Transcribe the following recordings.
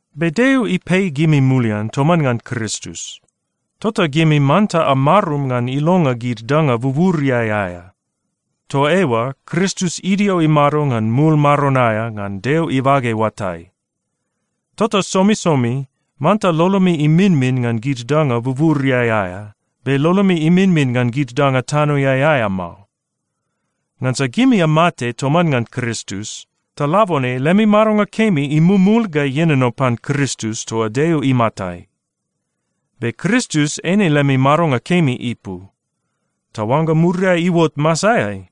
Be Deo ipei gimi mulian toman ngan Kristus, tota gimi manta amarum ngan ilonga gid danga buburiai aea. Toa eoa Kristus idio imado ngan mul maron aea ngan Deo ibage oatai. Tota somisomi manta lolomi iminmin ngan gid danga buburiai aea, be lolomi iminmin ngan gid danga tanoeai aea mao. Ngansa gimi amate toman ngan Kristus, ta labone lemi madonga kemi imumul ga ienono pan Kristus toa Deo imatai. Be Kristus eine lemi madonga kemi ipu, ta oangga muriai iuot masaeai,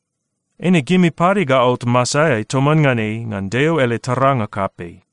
eine gimi pade ga aot masaeai toman ngan ei ngan Deo ele taranga kapei.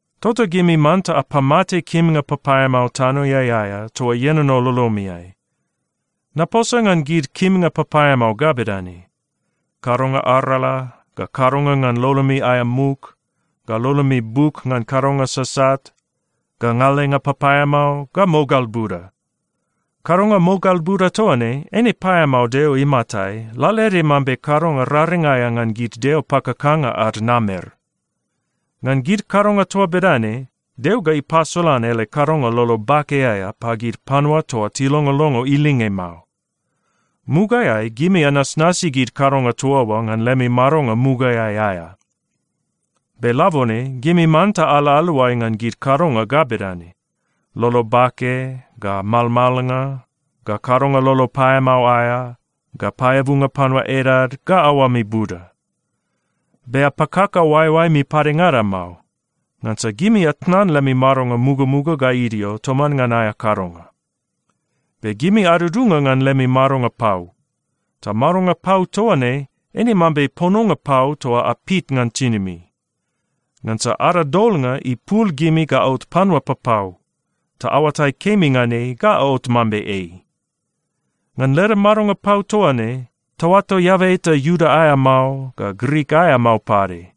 Tota gimi manta apamate kimnga papaeamao tanoeai aea toa ienono lolomiai. Naposa ngan gid kimnga papaeamao ga bedane: kadonga arala, ga kadonga ngan lolomi aea muk, ga lolomi buk ngan kadonga sasat, ga ngalenga papaeamao, ga mogal buda. Kadonga mogal buda toa ne, eine paeamao Deo imatai lalaede mambe kadonga raring aea ngan gid deo pakakanga ad namer. Ngan gid kadonga toa bedane, Deo ga ipasolan ele kadonga lolo bake aea pagid panua toa tilongolongo ilinge mao. Mugaeai gimi anasnasi gid kadonga toa oa ngan lemi madonga mugaeai aea. Be labone gimi manta ala aluai ngan gid kadonga ga bedane: lolo bake, ga malmalnga, ga kadonga lolo paeamao aea, ga paeabunga panua edad, ga aoami buda. Be apakaka oaeoaemi padengada mao, ngansa gimi atnan lemi madonga mugamuga ga idio toman ngan aea kadonga. Be gimi adudunga ngan lemi madonga pau, ta madonga pau toa ne eine mambe pononga pau toa apit ngan tinimi. Ngansa ada Dolnga ipul gimi ga aot panua papau, ta aoatai kemi ngan ei ga aot mambe ei. Ngan leda madonga pau toa ne, taoato eaba eta Iuda aea mao, ga Grik aea mao pade.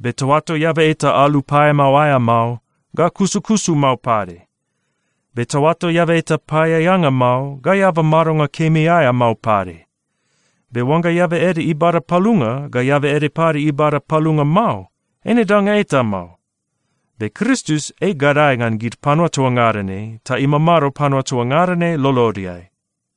Be taoato eaba eta alu paeamao aea mao, ga kusukusu mao pade. Be taoato eaba eta paeaeanga mao, ga eaba madonga kemi aea mao pade. Be oangga eaba ede ibada palunga, ga eaba ede pade ibada palunga mao, eine danga eta mao. Be Kristus ei gadae ngan gid panua toa ngada ne ta imamado panua toa ngada ne lolodeai.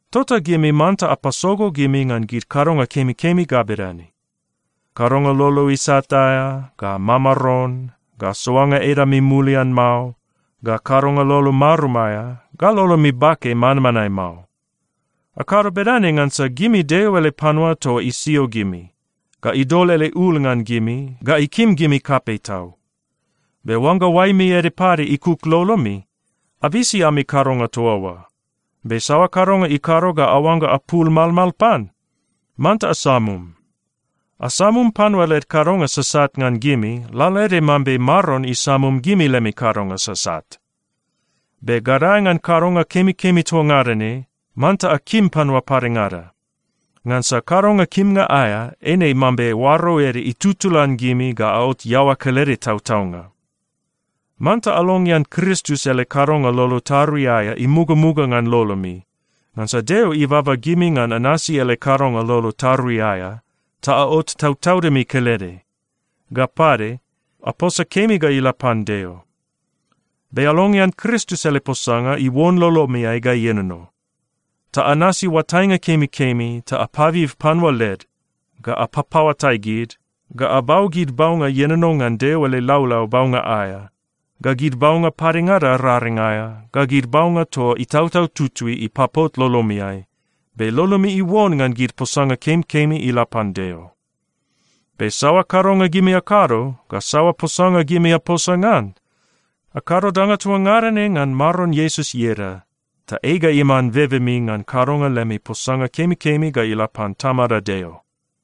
Tota gimi manta apasogo gimi ngan gid kadonga kemikemi ga bedane: kadonga lolo isat aea, ga mamaron, ga soanga edami mulian mao, ga kadonga lolo marum aea, ga lolomi bake manmanae mao. Akado bedane ngansa gimi Deo ele panua toa isio gimi, ga idol ele ul ngan gimi, ga ikim gimi kapei tau. Be oangga oaemi ede pade ikuk lolomi, abisi ami kadonga toa oa. Be saoa kadonga ikado ga aoangga apul malmal pan, manta asamum. Asamum panua led kadonga sasat ngan gimi, lalaede mambe Maron isamum gimi lemi kadonga sasat. Be gadae ngan kadonga kemikemi toa ngada ne, manta akim panua padengada. Ngansa kadonga kimnga aea eine mambe oaro ede itutulan gimi ga aot iaoa kelede tautaunga. Manta alongean Kristus ele kadonga lolo tarui aea imugamuga ngan lolomi, ngansa Deo ibaba gimi ngan anasi ele kadonga lolo tarui aea, ta aot tautaudimi kelede. Ga pade, aposa kemi ga ila pan Deo. Be alongean Kristus ele posanga iuon lolomiai ga ienono. Ta anasi oatainga kemikemi ta apabib panua led, ga apapaoatai gid, ga abau gid baunga ienono ngan Deo ele laulau baunga aea, ga gid baunga padengada raring aea, ga gid baunga toa Itautau Tutui ipapot lolomiai, be lolomi iuon ngan gid posanga kemikemi ila pan Deo. Be saoa kadonga gimi akado, ga saoa posanga gimi aposa ngan, akado danga toa ngada ne ngan Maron Iesus ieda, ta ei ga iman bebemi ngan kadonga lemi posanga kemikemi ga ila pan Tamada Deo.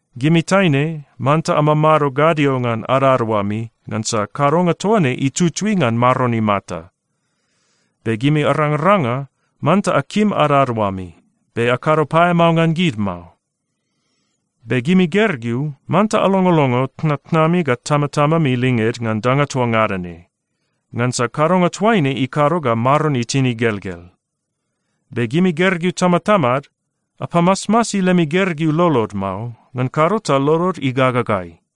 Gimi taine, manta amamado gadio ngan adadaoami, ngansa kadonga toa ne itutui ngan Maron imata. Be gimi arangaranga, manta akim adadaoami, be akado paeamao ngan gid mao. Be gimi gergeu, manta alongolongo tnatnami ga tamatamami linged ngan danga toa ngada ne. Ngansa kadonga toaine ikado ga Maron itin igelgel. Be gimi gergeu tamatamad, apamasmasi lemi gergeu lolod mao, ngan kado ta lolod igagagai.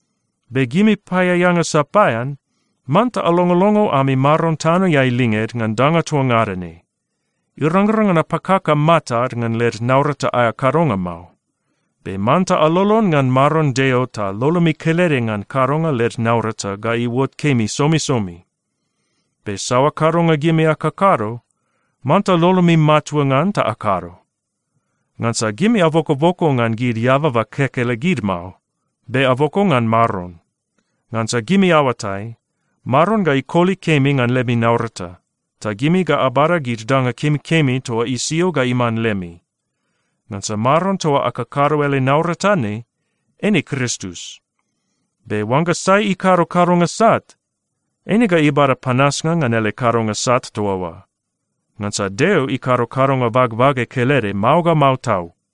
Be gimi paeaeanga sapaean, manta alongolongo ami maron tanoeai linged ngan danga toa ngada ne. Irangrang ngan apakaka matad ngan led naurata aea kadonga mao. Be manta alolon ngan Maron Deo ta lolomi kelede ngan kadonga led naurata ga iuot kemi somisomi. Be saoa kadonga gimi akakado, manta lolomi matua ngan ta akado. Ngansa gimi abokoboko ngan gid eababa kekelegid mao, be aboko ngan Maron. Ngansa gimi aoatai, Maron ga ikoli kemi ngan lemi naurata, ta gimi ga abada gid danga kemikemi toa isio ga iman lemi. Ngansa Maron toa akakado ele naurata ne eine Kristus. Be oangga sai ikado kadonga sat, eine ga ibada panasnga ngan ele kadonga sat toa oa. Ngansa Deo ikado kadonga bagbage kelede mao ga mao tau.